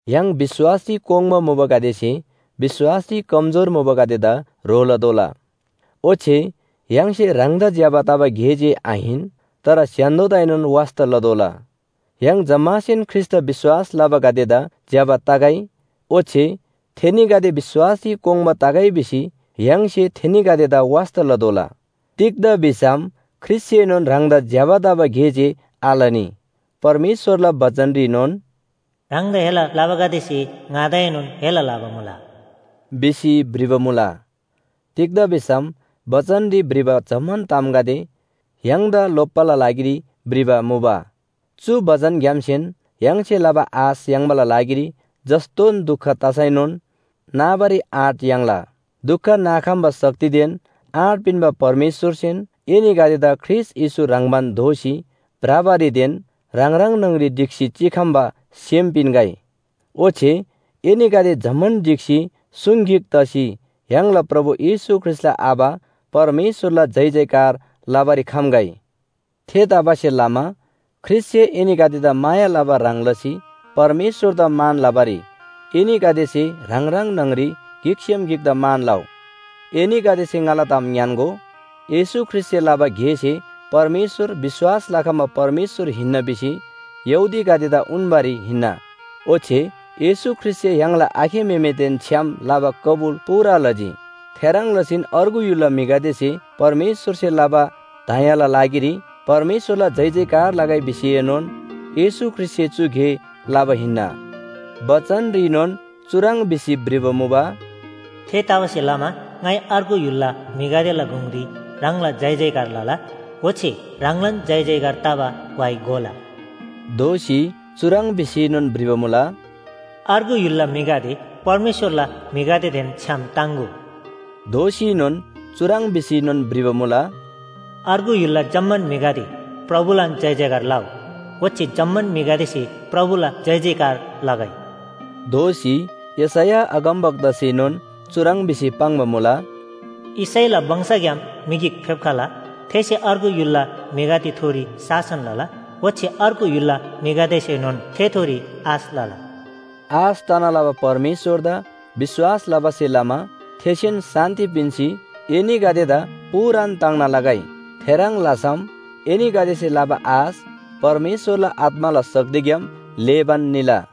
य्‍हाङ विश्‍वासरी कोङ्बा मुबागदेसे विश्‍वासरी कमजोर मुबागदेदा ह्रो लतोःला। ओच्‍छे य्‍हाङसे ह्राङदा ज्‍यबा तबा गे जे आहिन, तर स्‍य्‍हान्‍दोदाएनोन वास्‍ता लतोःला। य्‍हाङ जम्‍मासेन ख्रीष्‍टदा विश्‍वास लबागदेदा ज्‍यबा तगै, ओच्‍छे थेनीगदे विश्‍वासरी कोङ्बा तगै भिसी य्‍हाङसे थेनीगदेदा वास्‍ता लतोःला। तिग्‍दा भिसम ख्रीष्‍टसेनोन ह्राङदा ज्‍यबा तबा गे जे आलनी। परमेश्‍वरला बचनरीनोन “ह्राङदा हेला लबागदेसे ङादाएनोन हेला लबा मुला” भिसी भ्रिबा मुला। तिग्‍दा भिसम बचनरी भ्रिबा जम्‍मान तामगदे य्‍हाङदा लोप्‍बाला लागिरी भ्रिबा मुबा, चु बचनग्‍यामसेन य्‍हाङसे लबा आश याङ्बाला लागिरी जस्‍तोन दुख तसैनोन नाबारी आँट याङ्ला। दुख नाखम्‍बा शक्तिदेन आँट पिन्‍बा परमेश्‍वरसेन एनीगदेदा ख्रीष्‍ट येशू ह्रङ्‌बान दोसी भ्रबारीदेन ह्राङ ह्राङ न्‍हङरी ढिक्‍सी चिखम्‍बा सेम पिन्‍गै। ओच्‍छे एनीगदे जम्‍मान ढिक्‍सी सुङ गिक तसी य्‍हाङला प्रभु येशू ख्रीष्‍टला आबा परमेश्‍वरला जयजयकार लबारी खम्‍गै। थेतबासेलमा ख्रीष्‍टसे एनीगदेदा माया लबा ह्रङ् लसी परमेश्‍वरदा मान लबारी एनीगदेसे ह्राङ ह्राङ न्‍हङरी गिकसेम गिकदा मान लउ। एनीगदेसे ङाला ताम ङ्‌यान्‍गो, येशू ख्रीष्‍टसे लबा गेसे परमेश्‍वर विश्‍वास लखम्‍बा परमेश्‍वर हिन्‍ना भिसी यहूदीगदेदा उन्‍बारी हिन्‍ना। ओच्‍छे येशू ख्रीष्‍टसे य्‍हाङला आखे म्‍हेमेदेन छ्‌याम लबा कबुल पूरा लजी। थेह्रङ् लसीन अर्गु य्‍हुलला म्‍हिगदेसे परमेश्‍वरसे लबा दयाला लागिरी परमेश्‍वरला जयजयकार लगै भिसीएनोन येशू ख्रीष्‍टसे चु गे लबा हिन्‍ना। बचनरीनोन चुह्रङ् भिसी भ्रिबा मुबा, “थेतबासेलमा ङाइ अर्गु य्‍हुलला म्‍हिगदेला गुङरी ह्राङला जयजयकार लला, ओच्‍छे ह्राङलान जयजयकार तबा व्‍हाइ गोला।” दोःसी चुह्रङ् भिसीनोन भ्रिबा मुला, “अर्गु य्‍हुलला म्‍हिगदे, परमेश्‍वरला म्‍हिगदेदेन छ्‌याम ताङ्‍गो।” दोःसीनोन चुह्रङ् भिसीनोन भ्रिबा मुला “अर्गु य्‍हुलला जम्‍मान म्‍हिगदे, प्रभुलान जयजयकार लउ, ओच्‍छे जम्‍मान म्‍हिगदेसे प्रभुला जयजयकार लगै।” दोःसी यशैया अगमवक्तासेनोन चुह्रङ् भिसी पाङ्बा मुला, “यिशैला वंशग्‍याम म्‍हि गिक फेप्‍खला, थेसे अर्गु य्‍हुलला म्‍हिगदेथोरी शासन लला, ओच्‍छे अर्गु य्‍हुलला म्‍हिगदेसेनोन थेथोरी आश लला।” आश तना लबा परमेश्‍वरदा विश्‍वास लबासे लमा थेसेन शान्‍ति पिन्‍सी एनीगदेदा पूरान ताङ्ना लगै। थेह्रङ् लसम एनीगदेसे लबा आश परमेश्‍वरला आत्‍माला शक्तिग्‍याम ल्‍हेबान निला।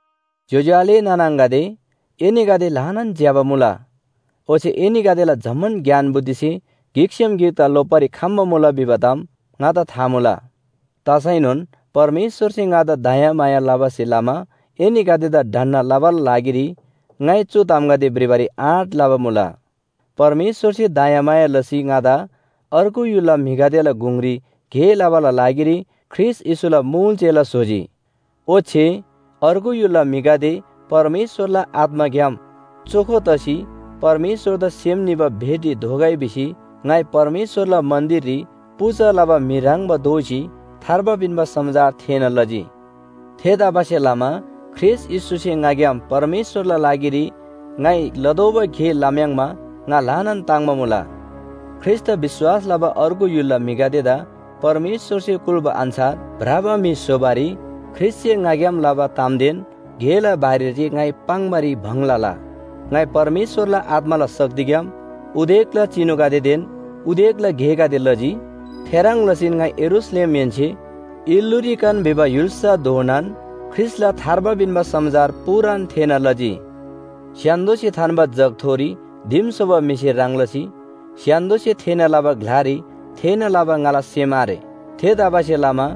ज्‍योज्‍यो आले नाना आङागदे, एनीगदे ल्‍हानान ज्‍यबा मुला, ओच्‍छे एनीगदेला जम्‍मान ज्ञान बुद्धिसे गिकसेम गिकदा लोप्‍बारी खम्‍मुला भिबा ताम ङादा था मुला। तसैनोन परमेश्‍वरसे ङादा दयामाया लबासे लमा एनीगदेदा ढन्‍ना लबाला लागिरी ङाइ चु तामगदे भ्रिबारी आँट लबा मुला। परमेश्‍वरसे दयामाया लसी ङादा अर्गु य्‍हुलला म्‍हिगदेला गुङरी गे लबाला लागिरी ख्रीष्‍ट येशूला मुल चेला स्‍होजी। ओच्‍छे अर्गु य्‍हुलला म्‍हिगदे परमेश्‍वरला आत्‍माग्‍याम चोखो तसी परमेश्‍वरदा सेम निबा भेटी दोगै भिसी ङाइ परमेश्‍वरला मन्‍दिररी पूजा लबा म्‍हि ह्रङ्‌बा दोसी थार्बा पिन्‍बा समाचार थेःना लजी। थेतबासेलमा ख्रीष्‍ट येशूसे ङाग्‍याम परमेश्‍वरला लागिरी ङाइ लतोःबा गे लम्‍याङ्मा ङा ल्‍हानान ताङ्‍बा मुला। ख्रीष्‍टदा विश्‍वास लबा अर्गु य्‍हुलला म्‍हिगदेदा परमेश्‍वरसे कुल्‍बा अन्‍छार भ्रबा म्‍हि स्‍होबारी ख्रीष्‍टसे ङाग्‍याम लबा तामदेन गेला बारेरी जे ङाइ पाङ्‌बारी भङ लला। ङाइ परमेश्‍वरला आत्‍माला शक्तिग्‍याम उदेकला चिनुगदेदेन उदेकला गेगदे लजी। थेह्रङ् लसीन ङाइ यरूशलेमहेन्‍से इल्‍लुरिकन भिबा य्‍हुल्‍साधोनान ख्रीष्‍टला थार्बा पिन्‍बा समाचार पूरान थेःना लजी। स्‍य्‍हान्‍दोसे थान्‍बा जगथोरी दिम स्‍होबा म्‍हिसे ह्रङ् लसी स्‍य्‍हान्‍दोसे थेःना लबा ग्‍लारी थेःना लबा ङाला सेम आरे। थेतबासेलमा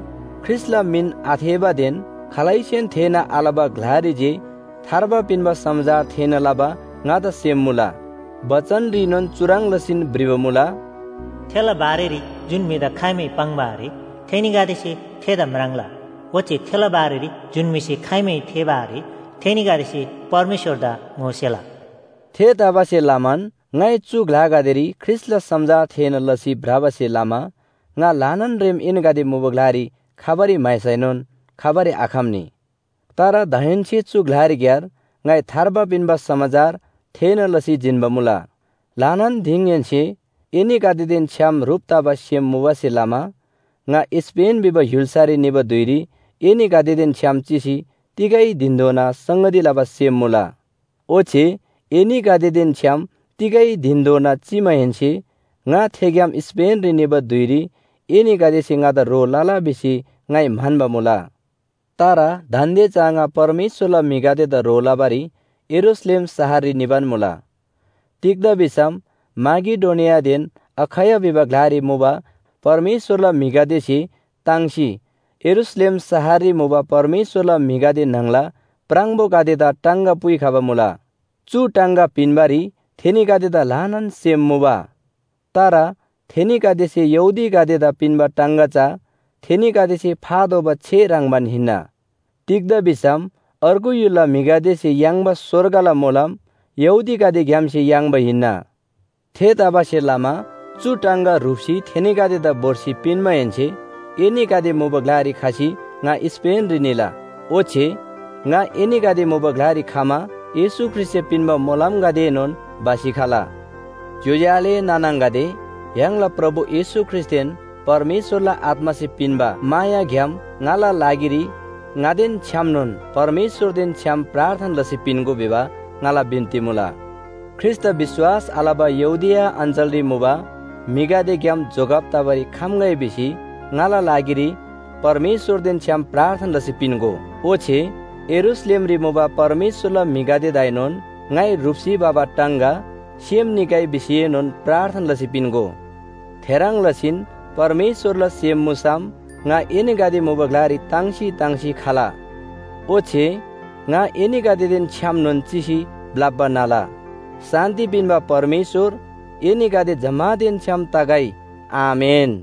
ख्रीष्‍टला मिन आथेःबादेन खालैसेन थेःना आलबा ग्‍लारी जे थार्बा पिन्‍बा समाचार थेःना लबा ङादा सेम मुला। बचनरीनोन चुह्रङ् लसीन भ्रिबा मुला, “थेला बारेरी जुन म्‍हिदा खाइमै पाङ्बा आरे, थेनीगदेसे थेदा म्राङ्ला। ओच्‍छे थेला बारेरी जुन म्‍हिसे खाइमै थेःबा आरे थेनीगदेसे परमेश्‍वरदा ङोसेला” थेतबासेलमान ङाइ चु ग्‍लागदेरी ख्रीष्‍टला समाचार थेःना लसी भ्रबासे लमा ङा ल्‍हानान रेम एनीगदे मुबा ग्‍लारी खबारी म्‍हाइसैनोन खबारी आखम्‍नी। तर दाहेन्‍से चु ग्‍लारीक्‍यार ङाइ थार्बा पिन्‍बा समाचार थेःना लसी जिन्‍बा मुला। ल्‍हानान दिङहेन्‍से एनीगदेदेन छ्‌याम ह्रुप तबा सेम मुबासे लमा, ङा स्‍पेन भिबा य्‍हुल्‍सारी निबा धुइरी एनीगदेदेन छ्‌याम चिसी तिगै धिनधोना संगती लबा सेम मुला। ओच्‍छे एनीगदेदेन छ्‌याम तिगै धिनधोना चिमाहेन्‍से ङा थेग्‍याम स्‍पेनरी निबा धुइरी एनीगदेसे ङादा ह्रो लला भिसी ङाइ म्‍हन्‍बा मुला। तर दान्‍दे चा ङा परमेश्‍वरला म्‍हिगदेदा ह्रो लबारी यरूशलेम शहररी निबान मुला। तिग्‍दा भिसम माकेडोनियादेन अखैया भिबा ग्‍लारी मुबा परमेश्‍वरला म्‍हिगदेसे ताङ्सी यरूशलेम शहररी मुबा परमेश्‍वरला म्‍हिगदे न्‍हङला प्राङबोगदेदा टाङगा पुइखबा मुला। चु टाङगा पिन्‍बारी थेनीगदेदा ल्‍हानान सेम मुबा। तर थेनीगदेसे यहूदीगदेदा पिन्‍बा टाङगा चा थेनीगदेसे फातोःबा छे ह्रङ्‌बान हिन्‍ना। तिग्‍दा भिसम अर्गु य्‍हुलला म्‍हिगदेसे याङ्बा स्‍वर्गला मोलम यहूदीगदेग्‍यामसे याङ्बा हिन्‍ना। थेतबासेलमा चु टाङगा ह्रुप्‍सी थेनीगदेदा भोर्सी पिन्‍माहेन्‍से एनीगदे मुबा ग्‍लारी खसी ङा स्‍पेनरी निला। ओच्‍छे ङा एनीगदे मुबा ग्‍लारी खमा येशू ख्रीष्‍टसे पिन्‍बा मोलमगदेएनोन भसी खला। ज्‍योज्‍यो आले नाना आङागदे, य्‍हाङला प्रभु येशू ख्रीष्‍टदेन परमेश्‍वरला आत्‍मासे पिन्‍बा मायाग्‍याम ङाला लागिरी ङादेन छ्‌यामनोन परमेश्‍वरदेन छ्‌याम प्रार्थना लसी पिन्‍गो भिबा ङाला बिन्‍ती मुला। ख्रीष्‍टदा विश्‍वास आलबा यहूदिया अञ्‍चलरी मुबा म्‍हिगदेग्‍याम जोगब तबारी खम्‍गै भिसी ङाला लागिरी परमेश्‍वरदेन छ्‌याम प्रार्थना लसी पिन्‍गो। ओच्‍छे यरूशलेमरी मुबा परमेश्‍वरला म्‍हिगदेदाएनोन ङाइ ह्रुप्‍सी भबा टाङगा सेम निगै भिसीएनोन प्रार्थना लसी पिन्‍गो। थेह्रङ् लसीन परमेश्‍वरला सेम मुसम ङा एनीगदे मुबा ग्‍लारी ताङ्सी ताङ्सी खला। ओच्‍छे ङा एनीगदेदेन छ्‌यामनोन चिसी ब्‍लप्‍बा न्‍हला। शान्‍ति पिन्‍बा परमेश्‍वर एनीगदे जम्‍मानदेन छ्‌याम तगै। आमेन।